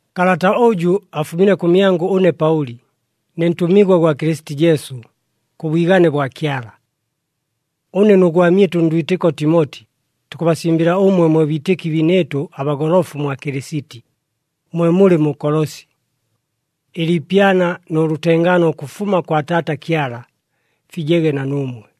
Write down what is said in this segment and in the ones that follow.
Kalata ʉjʉ afumile kʉmyangʉ ʉne Paʉli, ne ntʉmigwa gwa Kɨlɨsiti Jesu, kʉ bwigane bwa Kyala. Ʉne nʉ gwamyɨtʉ ndwitɨko Timoti, tukʉbasimbɨla ʉmwe mwe biitɨki biinɨɨtʉ abagolofu mwa Kɨlɨsiti, mwe mulɨ mu Kolosi. Ɨliipyana nʉ lʉtengaano ʉkʉfuma kwa Taata Kyala, fijege na nuumwe.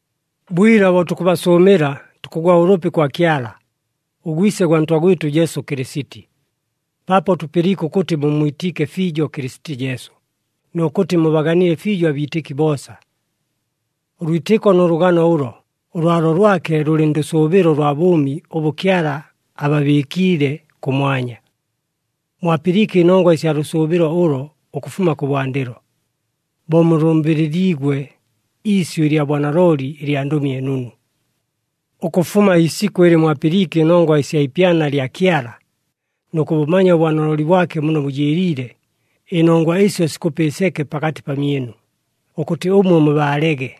Bwila bo tukʉbasʉʉmɨla, tukʉgwa ʉlʉpi kwa Kyala, ʉGwise gwa Ntwa gwɨtʉ Jesu Kɨlɨsiti, paapo tʉpɨliike ʉkʉtɨ mummwitiike fiijo Kɨlɨsiti Jesu, nʉ kʉtɨ mubaganile fiijo abiitɨki boosa. Ʉlwitɨko nʉ lʉgano ʉlo, ʉlwalo lwake lʉlɨ ndʉsʉʉbɨlo ʉlwa bʉʉmi ʉbʉ Kyala ababɨɨkiile kʉmwanya. Mwapɨliike ɨnongwa ɨsya lʉsʉʉbɨlo ʉlo ʉkʉfuma kʉbwandɨlo, bo mulʉmbɨlɨliigwe iisyʉ ɨlya bwanalooli ɨlya Ndʉmi ɨNunu. Ʉkʉfuma iisikʉ ɨlɨ mwapɨliike ɨnongwa ɨsya ipyana lya Kyala, nʉ kʉbʉmanya ʉbwanalooli bwake muno bʉjɨɨliile, ɨnongwa ɨsyo sikʉpa ɨseke pakatɨ pamyɨnu, ʉkʉtɨ ʉmwe mubaalege.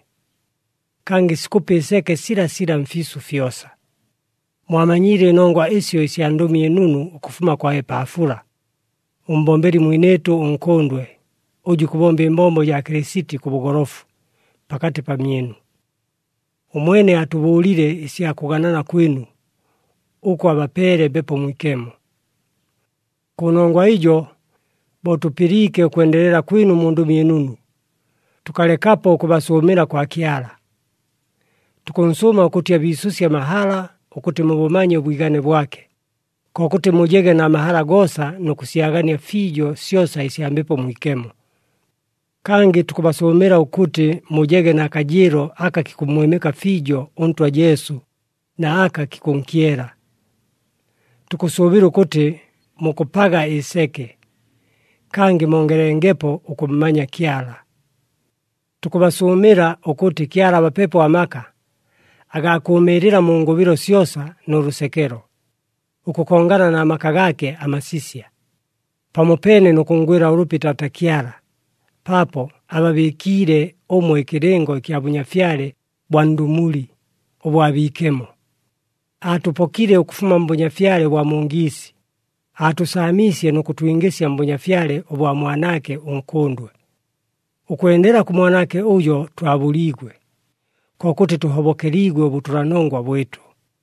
Kangɨ sikʉpa ɨseke silasila mfiisʉ fyosa. Mwamanyiile ɨnongwa ɨsyo ɨsya Ndʉmi ɨNunu ʉkʉfuma kwa Epaafula, ʉmbombeli mwinɨɨtʉ ʉnkʉndwe, ʉjʉ ikʉbomba ɨmbombo jaa Kɨlɨsiti kʉ bʉgolofu, pakatɨ pamyɨnu. Ʉmwene atʉbʉʉlile ɨsya kʉganana kwɨnu, ʉkʉ abapeele Mbepo Mwikemo. Kʉnongwa ɨjo, bo tʉpɨliike ʉkwendelela kwɨnu mu Ndʉmi ɨNunu, tʉkalekapo ʉkʉbasʉʉmɨla kwa Kyala. Tukʉnsʉʉma ʉkʉtɨ abiisʉsye amahala ʉkʉtɨ mubʉmanye ʉbwigane bwake, kokʉtɨ mujege na mahala goosa nʉ kʉsyagania fiijo syosa ɨsya Mbepo Mwikemo. Kangɨ tukʉbasʉʉmɨla ʉkʉtɨ mujege na kajɨɨlo aka kikʉmmwɨmɨka fiijo ʉNtwa Jesu na aka kikʉnkyela. Tukʉsʉʉbɨla ʉkʉtɨ mukʉpaga ɨseke, kangɨ mongelengepo ʉkʉmmanya Kyala. Tukʉbasʉʉmɨla ʉkʉtɨ Kyala abapepo amaka, agaa kʉʉmɨɨlɨla mu ngʉbɨlo syosa nʉ lʉsekelo, ʉkʉkongana na maka gaake amasisya, pamopeene nʉ kʉnngwɨla ʉlʉpi Taata Kyala, paapo ababɨɨkiile ʉmwe ɨkɨlɨngo ɨkya Bʉnyafyale bwa ndʉmuli, ʉbwa biikemo. Aatʉpokile ʉkʉfuma mbʉnyafyale ʉbwa mu ngiisi, aatʉsaamiisye nʉ kʉtwingɨsya mBʉnyafyale ʉbwa Mwanaake ʉNkʉndwe. Ʉkwendela kʉ Mwanaake ʉjo twabʉliigwe, kokʉtɨ tʉhobokeliigwe ʉbʉtʉlanongwa bwɨtʉ.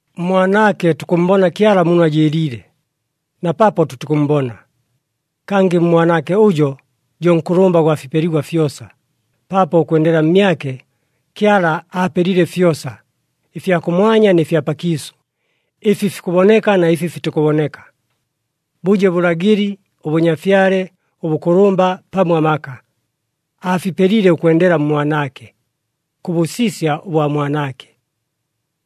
MMwanaake tukʉmmbona Kyala muno ajɨɨliile, na paapo tʉtikʉmmbona. Kangɨ ʉMwanaake ʉjo, jo nkʉlʉmba gwa fipeligwa fyosa, paapo ʉkwendela mmyake, Kyala aapelile fyosa, ɨfya kʉmwanya nɨ fya pakiisʉ, ɨfi fikʉboneka na ɨfi fitikʉboneka. Bʉje bʉlagɨli, ʉbʉnyafyale, ʉbʉkʉlʉmba pamo amaka, aafipelile ʉkwendela mMwanaake, kʉ bʉsisya ʉbwa Mwanaake.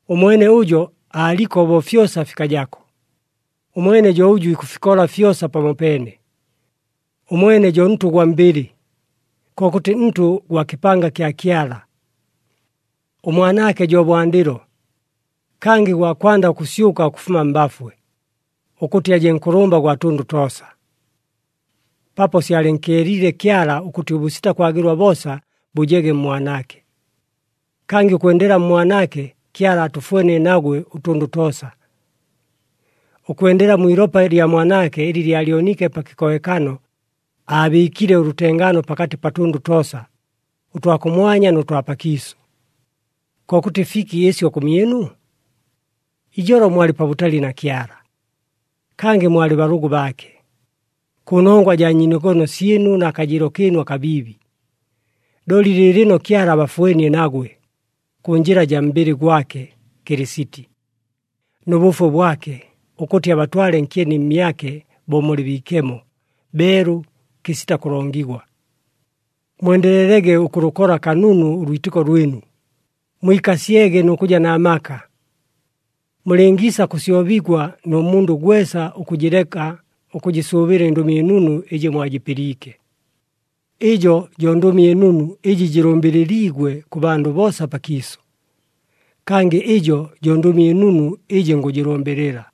Ʉmwene ʉjo aaliko bo fyosa fikajako, ʉmwene jo ʉjʉ ikʉfikola fyosa pamopeene. Ʉmwene jo ntʉ gwa mbɨlɨ, kokʉtɨ ntʉ gwa kɨpanga kya Kyala. ɄMwanaake jo bwandɨlo, kangɨ gwa kwanda ʉkʉsyʉka ʉkʉfuma mbafwe, ʉkʉtɨ aje nkʉlʉmba gwa tʉndʉ toosa. Paapo syalɨnkyeliile Kyala ʉkʉtɨ ʉbʉsita kwagɨlwa boosa bʉjege mMwanaake. Kangɨ ʉkwendela mMwanaake Kyala aatʉfwenie nagwe ʉtʉndʉ toosa. Ʉkwendela mwi ilopa lya Mwanaake ɨlɨ lyalyoniike pa kɨkohekano, aabɨɨkile ʉlʉtengaano pakatɨ pa tʉndʉ toosa, ʉtwa kʉmwanya nʉ twa pakiisʉ. Kokʉtɨ fiki ɨsyo kʉmyɨnu? Ijolo mwalɨ pabʉtali na Kyala. Kangɨ mwalɨ balʉgʉ baake, kʉnongwa jaa nyiinogono syɨnu na kajɨɨlo kɨɨnu akabiibi. Looli lɨɨlɨno Kyala abafwenie nagwe, kʉ njɨla jaa mbɨlɨ gwake Kɨlɨsiti, nʉ bʉfwe bwake, ʉkʉtɨ abatwale nkyeni mmyake bo mulɨ biikemo, beelu, kɨsita kʉlongigwa. Mwendelelege ʉkʉlʉkola kanunu ʉlwitɨko lwɨnu, mwikasyege nʉ kʉja na maka. Mulɨngiisa kʉsyobigwa nʉ mundʉ gwesa ʉkʉjɨleka ʉkʉjɨsʉʉbɨla ɨNdʉmi ɨNunu ɨjɨ mwajɨpɨliike. Ɨjo jo Ndʉmi ɨNunu ɨjɨ jɨlʉmbɨlɨliigwe kʉ bandʉ boosa pakiisʉ, kangɨ ɨjo jo Ndʉmi ɨNunu ɨjɨ ngʉjɨlʉmbɨlɨla.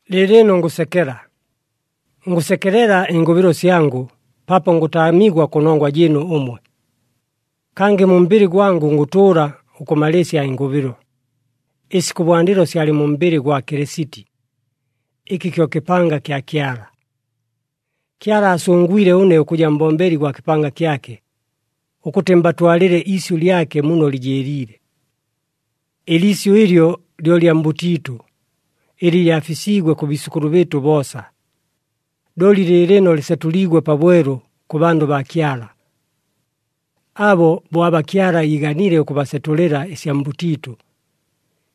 Lɨɨlɨno ngʉsekela! Ngʉsekelela ɨngʉbɨlo syangʉ, paapo ngʉtaamigwa kʉnongwa jɨɨnu ʉmwe. Kangɨ mu mbɨlɨ gwangʉ, ngʉtʉʉla ʉkʉmalɨɨsya ɨngʉbɨlo, ɨsi kʉbwandɨlo syalɨ mu mbɨlɨ gwa Kɨlɨsiti, ɨkɨ kyo kɨpanga kya Kyala. Kyala aasʉngwile ʉne ʉkʉja mbombeli gwa kɨpanga kyake, ʉkʉtɨ mbatwalɨle iisyʉ lyake muno lɨjɨɨliile. Ɨliisyʉ ɨlyo lyo lya mbʉtiitʉ, ɨlɨ lyafisiigwe kʉ biisʉkʉlʉ bɨɨtʉ boosa. Looli lɨɨlɨno lɨsetʉliigwe pabwelu kʉ bandʉ baa Kyala. Abo bo aba Kyala iiganile ʉkʉbasetʉlɨla ɨsya mbʉtiitʉ,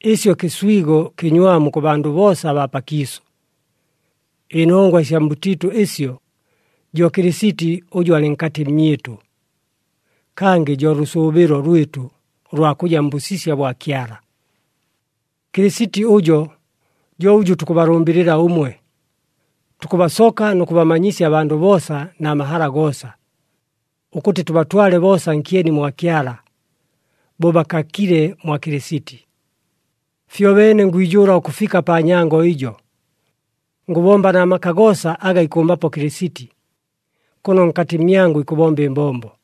ɨsyo kɨswigo kɨnywamu kʉ bandʉ boosa abaa pakiisʉ. Ɨnongwa ɨsya mbʉtiitʉ ɨsyo, jo Kɨlɨsiti ʉjʉ alɨ nkatɨ mmyɨtʉ, kangɨ jo lʉsʉʉbɨlo lwɨtʉ ʉlwa kʉja mbʉsisya bwa Kyala. Kɨlɨsiti ʉjo, jo ʉjʉ tukʉbalʉmbɨlɨla ʉmwe. Tukʉbasoka nʉ kʉbamanyisya abandʉ boosa na mahala goosa, ʉkʉtɨ tʉbatwale boosa nkyeni mwa Kyala, bo bakakile mwa Kɨlɨsiti. Fyobeene ngwijʉʉla ʉkʉfika pa nyango ɨjo, ngʉbomba na maka goosa aga ikʉmbapo Kɨlɨsiti, kʉno nkatɨ mmyangʉ ikʉbomba ɨmbombo.